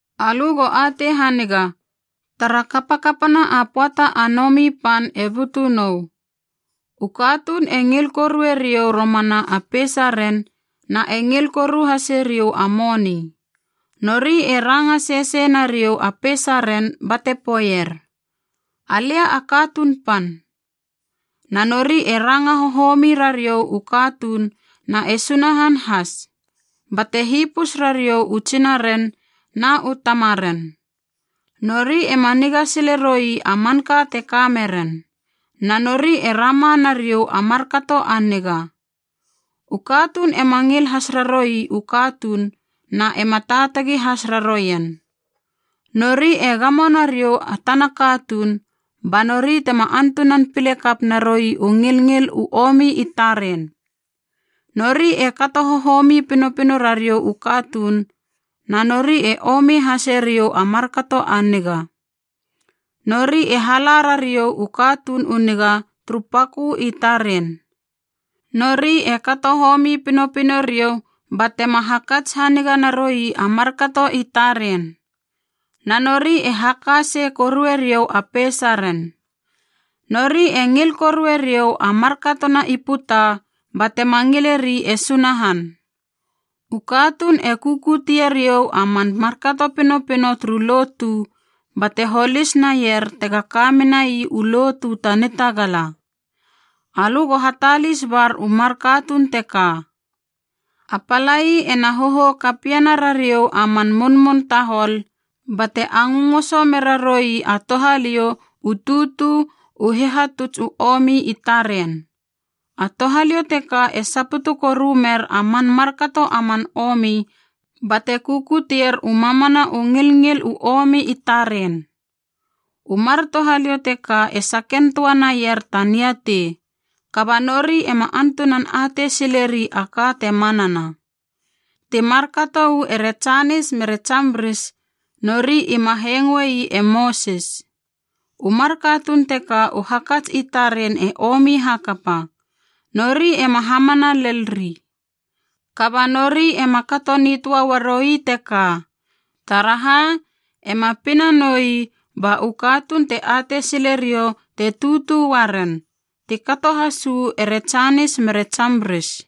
Alö go atei haniga, tara kapakapana a pöata a nomi pan e butu nou. U katuun e ngil korue riou romana a peisaren na e ngil koru hase riou a moni. Nori e ranga sesei nariou a peisaren bate poeier, “Alia a katuun pan.” Na nori e ranga hohomi rariou u katuun na e Sunahan has, bate hipus rariou u tsinaren na u tamaren. Nori ema niga sile roi a manka te ka meren, na nori e rama nariou a markato a niga. U katuun ema ngil has raroui u katuun na ema taatagi has raroien. Nori e gamo nariou a tana katuun ba nori tema antunan pile kap naroi u ngilngil u omi i taren. Nori e kato hohomi pinopino rariou u katuun, na nori e omi hase riou a markato a niga. Nori e hala rariou u katuun u niga turu pakö i taren. Nori e kato homi pinopino riou batema hakats haniga naroi a markato i taren. Na nori e haka sei korueriou a peisaren. Nori e ngil korue riou a markatona i puta batema ngileri e Sunahan. U katuun e kukutie riou a man markato pinopino turu lotu, bate holis naier tega ka menai u lotu ta nitagala. Alö go hatalis bar u mar katuun teka. A palai ena hohou kapiena rariou a man munmun tahol bate angöngoso mera roi a touhaliou u tutu u hihatuts u omi i taren. A touhaliou teka e saputu koru mer a man markato a man omi bate kukutier u mamana u ngilngil u omi i taren. U mar touhaliou teka e saken töa naier ta niatei, kaba nori ema antunan atei sileri a ka te manana. Ti markato uu ere Janis mere Jambris, nori ima hengoei e Mosis. U mar katuun teka u hakats i taren e omi hakapa, nori ema hamana lel ri. Kaba nori ema kato nitöa uaroi teka, taraha, ema pina noi ba u katuun te atei sile riou te tutu uaren, ti kato has uu ere Janis mere Jambris.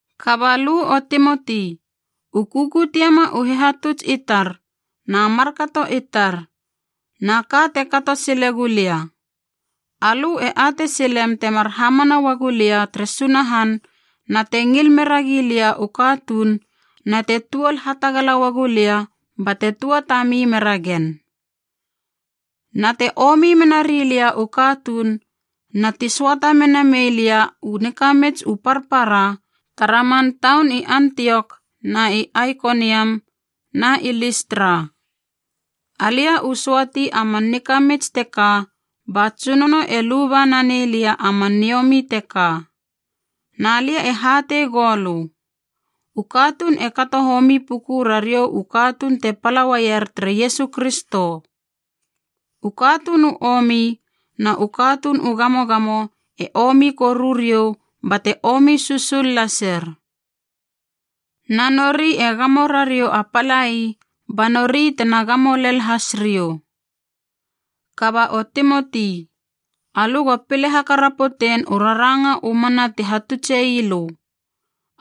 Kaba lö o Timoti, u kukutiema u hihatuts i tar, na markato i tar, na ka te kato sile gulia. Alö e atei silem temar hamana uagu lia tere Sunahan na te ngil meragi lia u katuun na te tuol hatagala uagu lia bate tuatami mera gen. Na te omi menari lia u katuun na ti söata mena mei lia u nikamits u parpara tara man taun i Antiok na i Aikoniam na i Listra. Alia u söati a man nikamits teka ba Tsunono e luba nanei lia a man niomi teka. Na lia e hatei goulö, u katuun e kato homi puku rariou u katuun te pala uaier tere Iesu Kristo. U katuun u omi na u katuun u gamogamo e omi koru riou bate omi susul lasir. Na nori e gamo rariou a palai, ba nori tena gamo lel has riou. Kaba o Timoti, alö go pile hakarapotein u raranga u mana ti hatutse ii lö.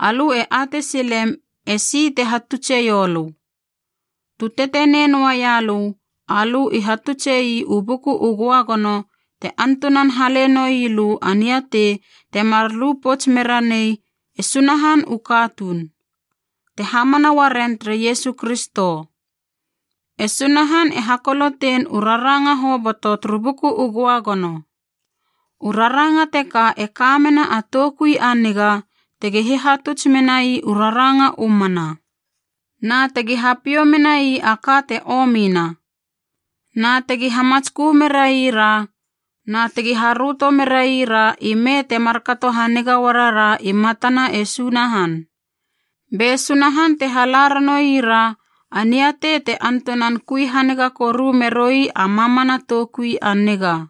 Alö e atei silem e si te hatutseiou lö. Tu tetenei noaia lö, alö i hatutse ii u Buku u Göagono te antunan hale noi lö a niatei temar lu pouts mera nei e Sunahan u katuun, te hamana uaren tere Iesu Kristo. E Sunahan e hakolotein u raranga hoboto turu Buku u Göagono. U raranga teka e ka mena a toukui a niga tegi hihatuts menai u raranga u mana, na tegi hapiou menai a ka te omina, na tegi hamatskö meraira, na tegi haröto meraira ime te markato haniga uarara i matana e Sunahan. Be Sunahan te hala ranoira a niatei te antunan kui haniga koru meroi a mamana toukui a niga.